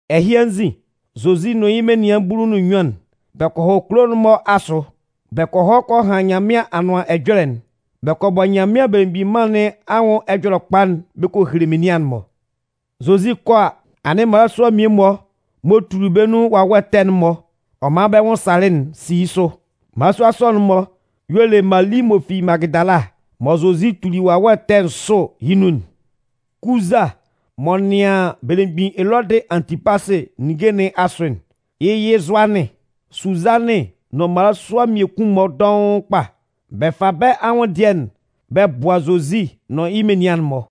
Ɛhɩ anzin, Zozi nʋn yɩ́ menian bulu nʋn nnyuan'n, bɛ kɔ hɔ kulo kulo'n-mɔ asʋ. Bɛ kɔ hɔ kɔ han Nyanmɩan Anʋan Ɛjɔlɛ'n. Bɛ kɔ bɔ Nyanmɩan Belemgbin Mân nɩn anwʋn Ɛjɔlɛkpa'n bɛ kɔ hele menian'n-mɔ. Zozi 'kɔ a, anɩn mmalasua mmie-mɔ m'ɔ tuli bɛ́ nun wawɛ ɛtɛ'n-mɔ ɔ man bɛ nwʋn salɩ'n si yɩ́ sʋ. Mmalasua sɔ'n-mɔ y'ɔ le: Mali m'ɔ fi Magɩdala mɔ Zozi tulɩ wawɛ ɛtɛ nsʋ yɩ́ nun'n. Kuza m'ɔ nɩan belemgbin Elɔdɩ Antɩpasɩ ninnge nɩn asʋ'n, yɩ́ yɩ Zʋanɩn. Suzanɩn nʋn mmalasua mmiekun-mɔ dɔʋn kpa. Bɛ fa bɛ́ anwʋndɩɛ'n bɛ bʋa Zozi nʋn yɩ́ menian'n-mɔ.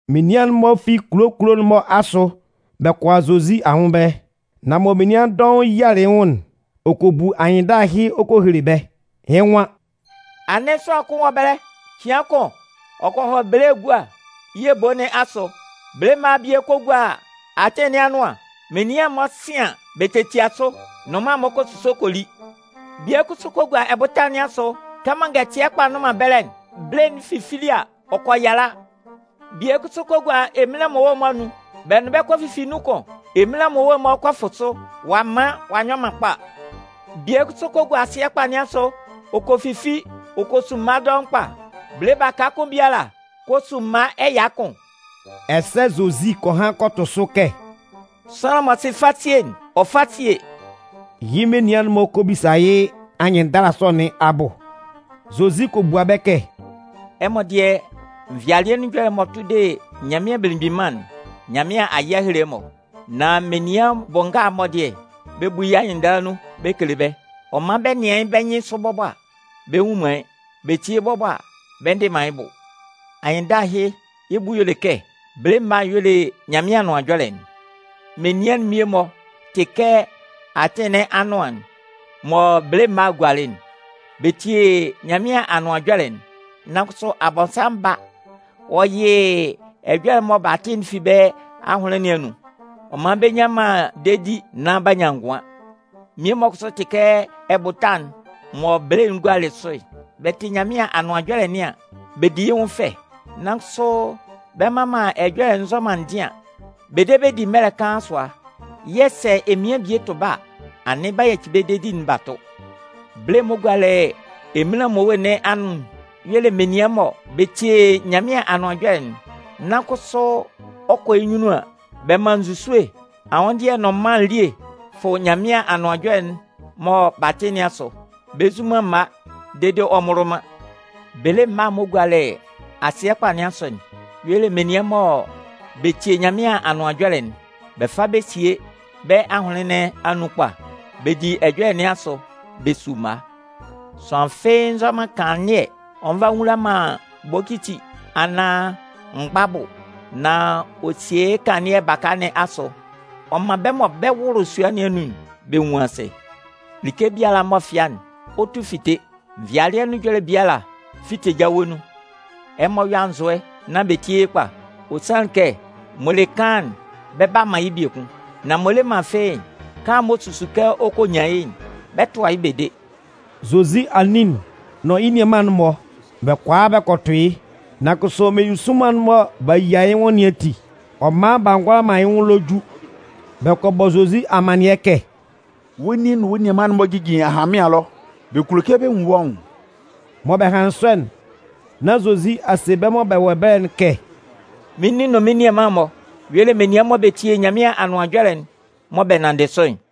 Menian'n-mɔ fi kulo kulo'n-mɔ asʋ bɛ kɔ a Zozi anwʋn ɛbɛlɛ. Nan mɔ menian dɔʋn yialɩ yɩ́ nwʋn'n, ɔ kɔ bu anyɩnndala ɛhɩ ɔ kɔ hele bɛ́. Yɩ́ nwan: “Anɩn sʋanlan kʋn wɔ ɛbɛlɛ. Cɩan kʋn, ɔ kɔ hɔ bele egua yɩ́ ebo nɩn asʋ. Bele mma'n bie kɔ gua atɩn nɩn anʋan. Menian'n-mɔ 'sɩn an, bɛ tetia sʋ. Nnʋnman'n-mɔ kɔ suso kɔ li. Bie kʋsʋ kɔ gua ɛbʋta nɩn asʋ. Kɛmɔ ngɛtɩɛ kpa nnʋn man ɛbɛlɛ'n, bele'n fifili a, ɔ kɔ yala. Bie kʋsʋ kɔ gua eminlan mmowe'n-mɔ anun, bɛ nʋn bɛ́ bɛ kɔ fifi nun kʋn. Eminlan mmowe'n-mɔ kɔ fʋ sʋ. Ɔ'a man ɔ'a nyɔ man kpa. Bie kʋsʋ kɔ gua asɩɛ kpa nɩn asʋ. Ɔ kɔ fifi ɔ kɔ su mma dɔʋn kpa. Bele baka kʋn biala kɔ su mma ɛya kʋn.” Ɛsɛ Zozi kɔ han kɔ tʋ sʋ kɛ: “Sʋanlan m'ɔ sɩ fasie'n, ɔ fá síe!” Yɩ́ menian'n-mɔ kɔ bisa yɩ́ anyɩnndala sɔ nɩn abʋ. Zozi kɔ bua bɛ́ kɛ: “Ɛmɔ dɩɛ, nvɩalɩɛ nun ɛjɔlɛ'n m'ɔ tʋ de Nyanmɩan Belemgbin Mân'n, Nyanmɩan a yɩ a hele ɛmɔ. Nan menian bʋ nga'n-mɔ dɩɛ, bɛ bu yɩ́ anyɩnndala nun bɛ kele bɛ́. Ɔ man bɛ nɩan yɩ́ bɛ́ nyɩnsʋ bɔbɔ a, bɛ nnwun man yɩ́. Bɛ tie bɔbɔ a, bɛ ndɩ man yɩ́ bʋ. “Anyɩnndala ɛhɩ, yɩ́ bʋ y'ɔ le kɛ: Bele mma'n y'ɔ le Nyanmɩan Anʋan Ɛjɔlɛ'n. Menian'n mmie-mɔ tɩ kɛ atɩn nɩn anʋan'n mɔ bele mma'n gualɩ'n. Bɛ tie Nyanmɩan Anʋan Ɛjɔlɛ'n, nan kʋsʋ Abɔnsanmʋn ba ɔ yɩ ɛjɔlɛ'n mɔ b'a tɩ'n fi bɛ́ ahʋnlɩn nɩn anun. Ɔ man bɛ nnyan man dedi nán b'a nyan ngʋan. Mmie-mɔ kʋsʋ tɩ kɛ ɛbʋta'n mɔ bele'n gualɩ sʋ'n. Bɛ tɩ Nyanmɩan Anʋan Ɛjɔlɛ nɩn an, bɛ di yɩ́ nwʋn fɛ. Nan kʋsʋ bɛ mman man ɛjɔlɛ'n nzɔ man ndɩan. Bɛ de bɛ di mɛlɛ kaan sʋa yɛ̂ sɛ emian bie tʋ bɛ́ a, anɩn b'a yaci bɛ́ dedi'n b'a tʋ. Bele'n m'ɔ gualɩ eminlan mmowe nɩn anun'n, y'ɔ le menian mɔ bɛ tie Nyanmɩan Anʋan Ɛjɔlɛ'n, nan kʋsʋ ɔ 'kɔ yɩ́ nyunnun an, bɛ man nzusue, anwʋndɩɛ nʋn mân elie fʋ Nyanmɩan Anʋan Ɛjɔlɛ'n mɔ b'a tɩ nɩn asʋ. Bɛ nzu man mma dede ɔ mmʋlʋ man. Bele mma'n m'ɔ gualɩ asɩɛ kpa nɩn asʋ'n, y'ɔ le menian mɔ bɛ tie Nyanmɩan Anʋan Ɛjɔlɛ'n, bɛ fa bɛ sie bɛ́ ahʋnlɩn nɩn anun kpa, bɛ di ɛjɔlɛ nɩn asʋ, bɛ su mma. “Sʋanlan fɩ́ɩ́ nzɔ man kanlannɩɛ, ɔ nva ɔ nwula man bokiti, anaan mgba abʋ. Nan ɔ sie yɩ́ kanlannɩɛ'n baka nɩn asʋ, ɔ man bɛ́ mɔ bɛ 'wʋlʋ sua nɩn anun'n, bɛ nwun asɩ. Like biala m'ɔ fɩa'n, ɔ 'tu fite. Nvɩalɩɛ nun ɛjɔlɛ biala 'fite jawe nun. Ɛmɔ yɔ́ anzʋɛ, nán bɛ tíe yɩ́ kpa! Ɔ sanlɩn kɛ m'ɔ le kaan'n, bɛ 'ba man yɩ́ biekun. Nan m'ɔ le man fɩ́ɩ́'n, kaan'n m'ɔ susu kɛ ɔ kɔ nyan yɩ́'n, bɛ 'tʋa yɩ́ bɛ de.” Zozi anin'n nʋn yɩ́ nianman'n-mɔ, bɛ kɔ a bɛ kɔ tʋ yɩ́. Nan kʋsʋ meninsʋnman'n mɔ b'a yia yɩ́ nwʋn nɩn ati, ɔ man b'a ngʋala man yɩ́ nwʋn ɛlɔ ju. Bɛ kɔ bɔ Zozi amannɩɛ kɛ: “Wɔ́ nin nʋn wɔ́ nianman'n-mɔ jijin ahanmɩan ɛlɔ, bɛ kulo kɛ bɛ nwun wɔ́ nwʋn.” Mɔ bɛ hanlɩn sɔ'n, nán Zozi a se bɛ́ mɔ bɛ wɔ ɛbɛlɛ'n kɛ: “Mɩ́n nin nʋn mɩ́n nianman'n-mɔ y'ɔ le menian mɔ bɛ tie Nyanmɩan Anʋan Ɛjɔlɛ'n, mɔ bɛ nanndɩ sʋ'n.”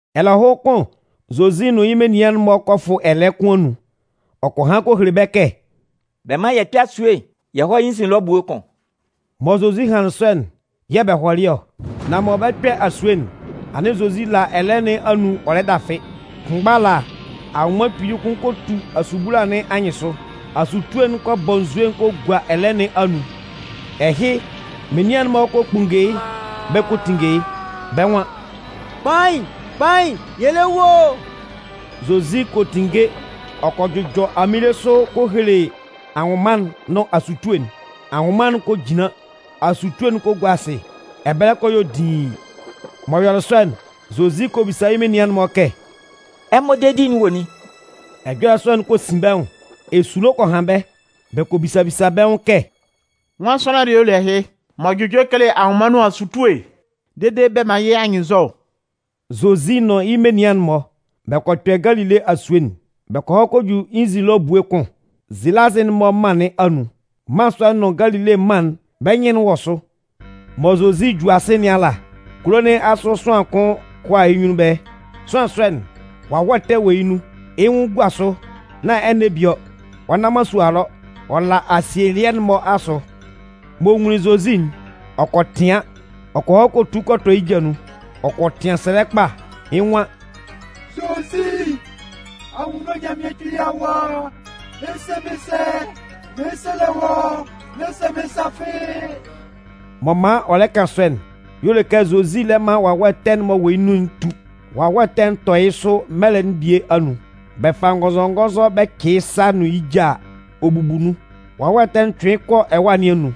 Ɛlɛhʋn kʋn Zozi nʋn yɩ́ menian'n-mɔ kɔ fʋ ɛlɛɛ kʋn anun. Ɔ kɔ han kɔ hele bɛ́ kɛ: “Bɛ mán yɛ kpɛ́ asue'n yɛ hɔ́ yɩ́ nzin ɛlɔ ebue kʋn.” Mɔ Zozi hanlɩn sɔ'n, yɛ̂ bɛ hɔlɩ ɔ. Nan mɔ bɛ 'kpɛ asue'n, anɩn Zozi la ɛlɛɛ nɩn anun ɔ lɛ dafɩ. Kʋnmgba ala, anwʋnman kpili kʋn kɔ tu asubula nɩn anyɩnsʋ. Asutue'n kɔ bɔ nzue kɔ gua ɛlɛɛ nɩn anun. Ɛhɩ, yɩ́ menian'n-mɔ kɔ kpunnge yɩ́ bɛ kɔ tinnge yɩ́. Bɛ́ nwan: “Kpain, kpain, yɛ lɛ wu o!” Zozi kɔ tinnge ɔ kɔ jʋjɔ aminle sʋ kɔ hele anwʋnman'n nʋn asutue'n. Anwʋnman'n kɔ jinlan, asutue'n kɔ gua asɩ. Ɛbɛlɛ kɔ yɔ diin. M'ɔ yɔlɩ sɔ'n, Zozi kɔ bisa yɩ́ menian'n-mɔ kɛ: “Ɛmɔ dedi'n wɔ nin?” Ɛjɔlɛ'n kɔ sin bɛ́ nwʋn, esulo kɔ han bɛ́. Bɛ kɔ bisa bisa bɛ́ nwʋn kɛ: “Nwan sʋanlan dɩɛ y'ɔ le ɛhɩ? M'ɔ jʋjɔ kele anwʋnman nʋn asutue dede bɛ man yɩ́ anyɩnnzɔ!” Zozi nʋn yɩ́ menian'n-mɔ, bɛ kɔ kpɛ Galile asue'n. Bɛ kɔ hɔ kɔ ju yɩ́ nzin ɛlɔ ebue kʋn, Zelazɩ'n-mɔ mân nɩn anun. Mân sɔ'n nʋn Galile mân'n, bɛ́ nyɩn'n wɔ sʋ. Mɔ Zozi 'ju asɩ nɩn ala, kulo nɩn asʋ sʋanlan kʋn kɔ a yɩ́ nwʋn ɛbɛlɛ. Sʋanlan sɔ'n, wawɛ ɛtɛ wɔ yɩ́ nun. Yɩ́ nwʋn gua sʋ, nán ɛnɛ bie ɔ. Ɔ nna man sua ɛlɔ. Ɔ la asielɩɛ'n-mɔ asʋ. M'ɔ nwunlin Zozi'n, ɔ kɔ tɩan. Ɔ kɔ hɔ kɔ tu kɔ tɔ yɩ́ ja nun. Ɔ kɔ tɩan sɛlɛ kpa, Yɩ́ nwan: “Zozi, Anwunno Nyanmɩan Kpili Awa, ɛ se mɩ́n sɛ? Mɩn 'sɛlɛ wɔ́, n'ɛ se mɩ́n sa fɩ́ɩ́.” M'ɔ man ɔ lɛ kan sɔ'n, y'ɔ le kɛ Zozi lɛ man wawɛ ɛtɛ'n m'ɔ wɔ yɩ́ nun'n tu. Wawɛ ɛtɛ'n tɔ yɩ́ sʋ mɛlɛ'n bie anun. Bɛ fa ngɔnzɔngɔnzɔ bɛ cɩ yɩ́ sa nʋn yɩ́ ja a, ɔ bubu nun. Wawɛ ɛtɛ'n cʋɩn yɩ́ kɔ ɛwâ nɩn anun.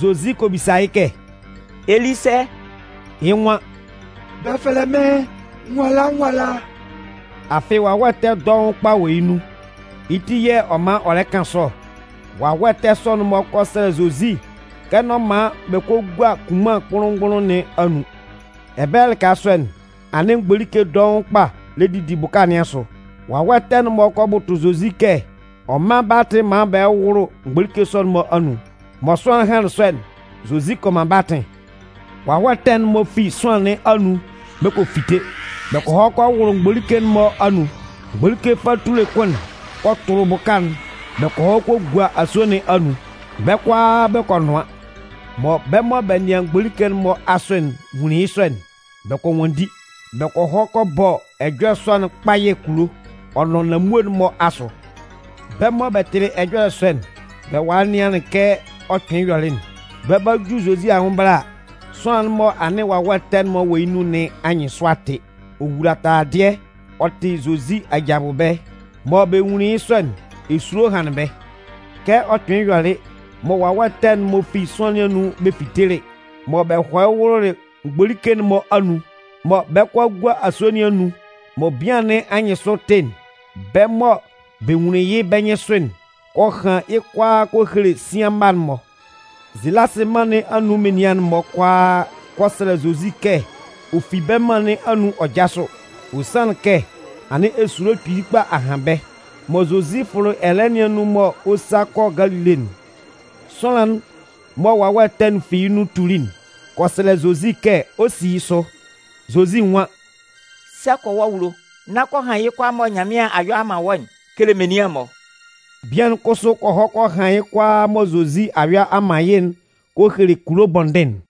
Zozi kɔ bisa yɩ́ kɛ: “Ɛ li sɛ?” Yɩ́ nwan: “Bɛ fɛlɛ mɩ́n nwala nwala.” Afɩ wawɛ ɛtɛ dɔʋn kpa wɔ yɩ́ nun, yɩ́ ti yɛ̂ ɔ man ɔ lɛ kan sɔ ɔ. Wawɛ ɛtɛ sɔ'n-mɔ kɔ sɛlɛ Zozi kɛ n'ɔ man bɛ kɔ gua kunman kpʋnlʋn-mgbʋnlʋn nɩn anun. Ɛbɛlɛ lɩka sɔ'n, anɩn mgbolike dɔʋn kpa lɛ didi bʋka nɩn asʋ. Wawɛ ɛtɛ'n-mɔ kɔ bʋtʋ Zozi kɛ ɔ mán bɛ́ atɩn maan bɛ hɔ́ wʋ́lʋ mgbolike sɔ'n-mɔ anun. Mɔ sʋanlan'n hanlɩn sɔ'n, Zozi kɔ man bɛ́ atɩn. Wawɛ ɛtɛ'n-mɔ fi sʋanlan nɩn anun bɛ kɔ fite. Bɛ kɔ hɔ kɔ wʋlʋ mgbolike'n-mɔ anun. Mgbolike fatule kʋn'n kɔ tʋlʋ bʋka'n bɛ kɔ hɔ kɔ gua asue nɩn anun, bɛ́ kʋalaa bɛ kɔ nʋan. Mɔ bɛ́ mɔ bɛ nɩan mgbolike'n-mɔ asʋ'n nwunlin yɩ́ sɔ'n, bɛ kɔ nwanndi. Bɛ kɔ hɔ kɔ bɔ ɛjɔlɛ sɔ'n kpayɛ kulo, ɔ nʋn nanmue'n-mɔ asʋ. Bɛ́ mɔ bɛ tɩlɩ ɛjɔlɛ sɔ'n, bɛ walɩ nɩanlɩn kɛ ɔ kpɩnlɩn yɔlɩ'n. Bɛ 'ba ju Zozi anwʋn ɛbɛlɛ a, sʋanlan'n mɔ anɩn wawɛ ɛtɛ'n-mɔ wɔ yɩ́ nun nɩn anyɩnsʋ a tɩ. Ɔ wula taladɩɛ ɔ tɩ Zozi aja abʋ ɛbɛlɛ. Mɔ bɛ nwunlin yɩ́ sɔ'n, esulo hanlɩn bɛ́. Kɛ ɔ kpɩnlɩn yɔlɩ mɔ wawɛ ɛtɛ'n-mɔ fi sʋanlan nɩn anun bɛ fitelɩ, mɔ bɛ hɔlɩ wʋlʋlɩ mgbolike'n-mɔ anun, mɔ bɛ 'kɔ a gua asue nɩn anun, mɔ bian nɩn anyɩnsʋ tɩ'n, bɛ́ mɔ bɛ nwunlin yɩ́ bɛ́ nyɩnsʋ'n kɔ han yɩ́ kʋalaa kɔ hele sian mma'n-mɔ. Zelasɩ mân nɩn anun menian'n-mɔ kʋalaa kɔ sɛlɛ Zozi kɛ ɔ fi bɛ́ mân nɩn anun ɔ jásʋ. Ɔ sanlɩn kɛ anɩn esulo kpili kpa a han bɛ́. Mɔ Zozi fʋlɩ ɛlɛɛ nɩn anun mɔ ɔ 'sa kɔ Galile'n, sʋanlan'n mɔ wawɛ ɛtɛ'n fi yɩ́ nun tuli'n kɔ sɛlɛ Zozi kɛ ɔ 'si yɩ́ sʋ. Zozi nwan: “Sa kɔ wɔ́ awulo, nán kɔ han yɩ́ kʋalaa mɔ Nyanmɩan a yɔ a man wɔ́'n kele menian'n-mɔ.” Bian'n kʋsʋ kɔ hɔ ɔ kɔ han yɩ́ kʋalaa mɔ Zozi a yɔ a man yɩ́'n kɔ hele kulo bɔndɩn'n.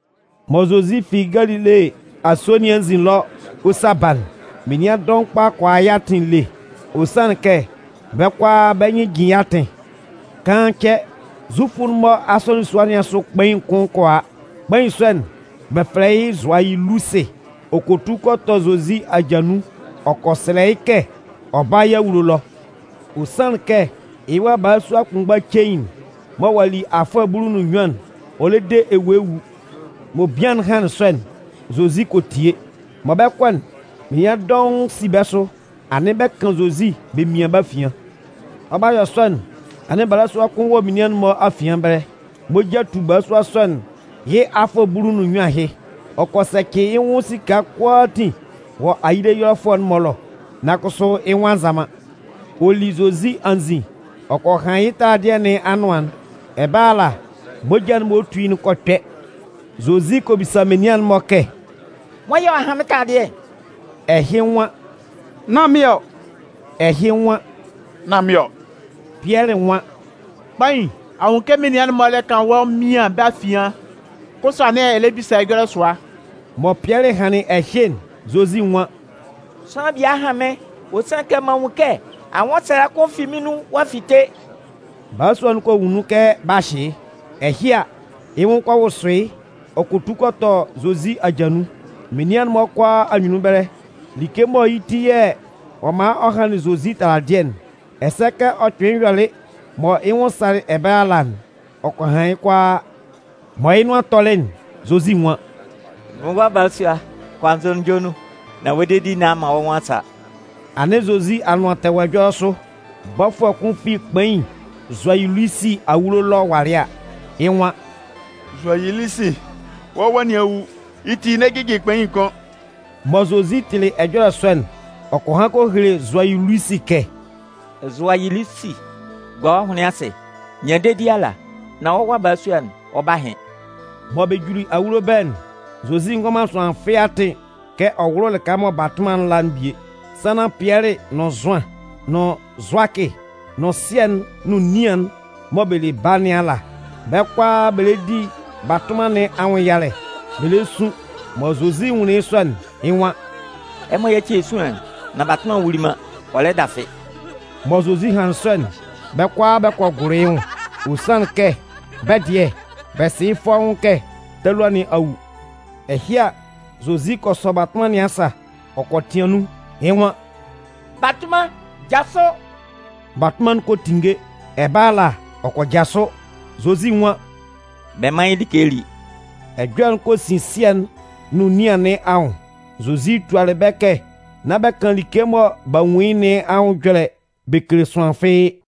Mɔ Zozi fi Galile asue nɩn anzin ɛlɔ ɔ 'sa ba'n, menian dɔʋn kpa kɔ a yɩ́ atɩn ele. Ɔ sanlɩn kɛ bɛ́ kʋalaa bɛ́ nyɩn jin yɩ́ atɩn. Kaan cɛ, Zufʋ'n-mɔ asɔnɩn sua nɩn asʋ kpain'n kɔ a, kpain sɔ'n, bɛ fɛlɛ yɩ́ Zʋayilusɩ. Ɔ kɔ tu kɔ tɔ Zozi aja nun ɔ kɔ sɛlɛ yɩ́ kɛ ɔ bála yɩ́ awulo ɛlɔ. Ɔ sanlɩn kɛ yɩ́ wa balasua kʋnmgba cein'n mɔ ɔ'a li afʋɛ bulu nʋn nnyuan'n, ɔ lɛ de ewue wu. Mɔ bian'n hanlɩn sɔ'n, Zozi kɔ tie. Mɔ bɛ 'kɔ'n, menian dɔʋn si bɛ́ sʋ, anɩn bɛ 'kan Zozi bɛ mian bɛ́ afian. Ɔ 'ba yɔ sɔ'n, anɩn balasua kʋn wɔ menian'n-mɔ afian ɛbɛlɛ. Moja tu balasua sɔ'n yɩ́ afʋɛ bulu ɔ nʋn nnyuan ahɩ. Ɔ kɔ sɛcɩ yɩ́ nwʋn esika kʋalaatin wɔ ayile ɛyɔlɛfʋɛ'n-mɔ ɛlɔ. Nan kʋsʋ yɩ́ nwʋn a nza man. Ɔ li Zozi anzin, ɔ kɔ han yɩ́ taladɩɛ nɩn anʋan'n. Ɛbɛlɛ ala, moja'n m'ɔ tu yɩ́'n kɔ kpɛ. Zozi kɔ bisa menian'n-mɔ kɛ: “Nwan yɛ̂ ɔ'a han mɩ́n taladɩɛ'n?” Ɛhɩ nwan “Nán mɩ́n ɔ!” Ɛhɩ nwan: “Nán mɩ́n ɔ!” Pɩɛlɩ nwan: “Kpain, a nwun kɛ menian'n-mɔ lɛ kan wɔ́ mian bɛ afian, kʋsʋ anɩn ɛ lɛ bisa ɛjɔlɛ sʋa!” Mɔ Pɩɛlɩ hanlɩn ɛhɩ'n, Zozi nwan: “Sʋanlan bie a han mɩ́n, ɔ sanlɩn kɛ m'an nwun kɛ anwʋnsɛlɛ kʋn fi mɩ́n nun ɔ'a fite.” Balasua'n kɔ nwun nun kɛ b'a hyɩ yɩ́. Ɛhɩ a, yɩ́ nwʋn kɔ wʋsʋ yɩ́ ɔ kɔ tu kɔ tɔ Zozi aja nun. Menian'n-mɔ kʋalaa anyunnun ɛbɛlɛ, like mɔ yɩ́ ti yɛ̂ ɔ man ɔ hanlɩn Zozi taladɩɛ'n, ɛsɛ kɛ ɔ kpɩnlɩn yɔlɩ mɔ yɩ́ nwʋn salɩ ɛbɛlɛ ala'n, ɔ kɔ han yɩ́ kʋalaa. Mɔ yɩ́ nʋan tɔlɩ'n, Zozi nwan: “Mɩ́n wa balasua, kɔ anzʋnunjɔ nun, nán wɔ́ dedi nɩn a man wɔ́ nwʋn a sa.” Anɩn Zozi anʋan tɛ wɔ ɛjɔlɛ sʋ. Bɔfʋɛ kʋn fi kpain Zʋayilusi awulo ɛlɔ walɩ a, yɩ́ nwan: “Zʋayilusi, wɔ́ wa nɩn a wu, yɩ́ ti n'ɛ jɩjɩ kpain kʋ́n.” Mɔ Zozi tɩlɩ ɛjɔlɛ sɔ'n, ɔ kɔ han kɔ hele Zʋayilusi kɛ: “Zʋayilusi, gua wɔ́ ahʋnlɩn asɩ, nyan dedi ala, nán wɔ́ wa balasua'n, ɔ 'ba hɩn.” Mɔ bɛ juli awulo ɛbɛlɛ'n, Zozi ngɔ man sʋanlan fɩ́ɩ́ atɩn kɛ ɔ wʋ́lʋ lɩka mɔ batʋnman'n la'n bie, sannan Pɩɛlɩ nʋn Zʋan, nʋn Zʋakɩ, nʋn sɩɛ'n nʋn nian'n mɔ bɛ le baa nɩn ala. Bɛ́ kʋalaa bɛ lɛ di batʋnman nɩn anwʋn yalɛ, bɛ le sun. Mɔ Zozi nwunlin yɩ́ sɔ'n, yɩ́ nwan: “Ɛmɔ yáci esuan'n nán batʋnman'n wuli man, ɔ lɛ dafɩ.” Mɔ Zozi hanlɩn sɔ'n, bɛ́ kʋalaa bɛ kɔ gʋlʋ yɩ́ nwʋn. Ɔ sanlɩn kɛ bɛ́ dɩɛ, bɛ sɩ yɩ́ fɔ́ʋ́n kɛ talua nɩn a wu. Ɛhɩ a, Zozi kɔ sɔ batʋnman nɩn asa, ɔ kɔ tɩan nun. Yɩ́ nwan: “Batʋnman, jasʋ!” Batʋnman'n kɔ tinnge, ɛbɛlɛ ala ɔ kɔ jasʋ. Zozi nwan: “Bɛ mán yɩ́ like lí.” Ɛjɔlɛ'n kɔ sin sɩɛ'n nʋn nian nɩn anwʋn. Zozi tualɩ bɛ́ kɛ nán bɛ kan like mɔ b'a nwun yɩ́ nɩn anwʋn ɛjɔlɛ bɛ kele sʋanlan fɩ́ɩ́.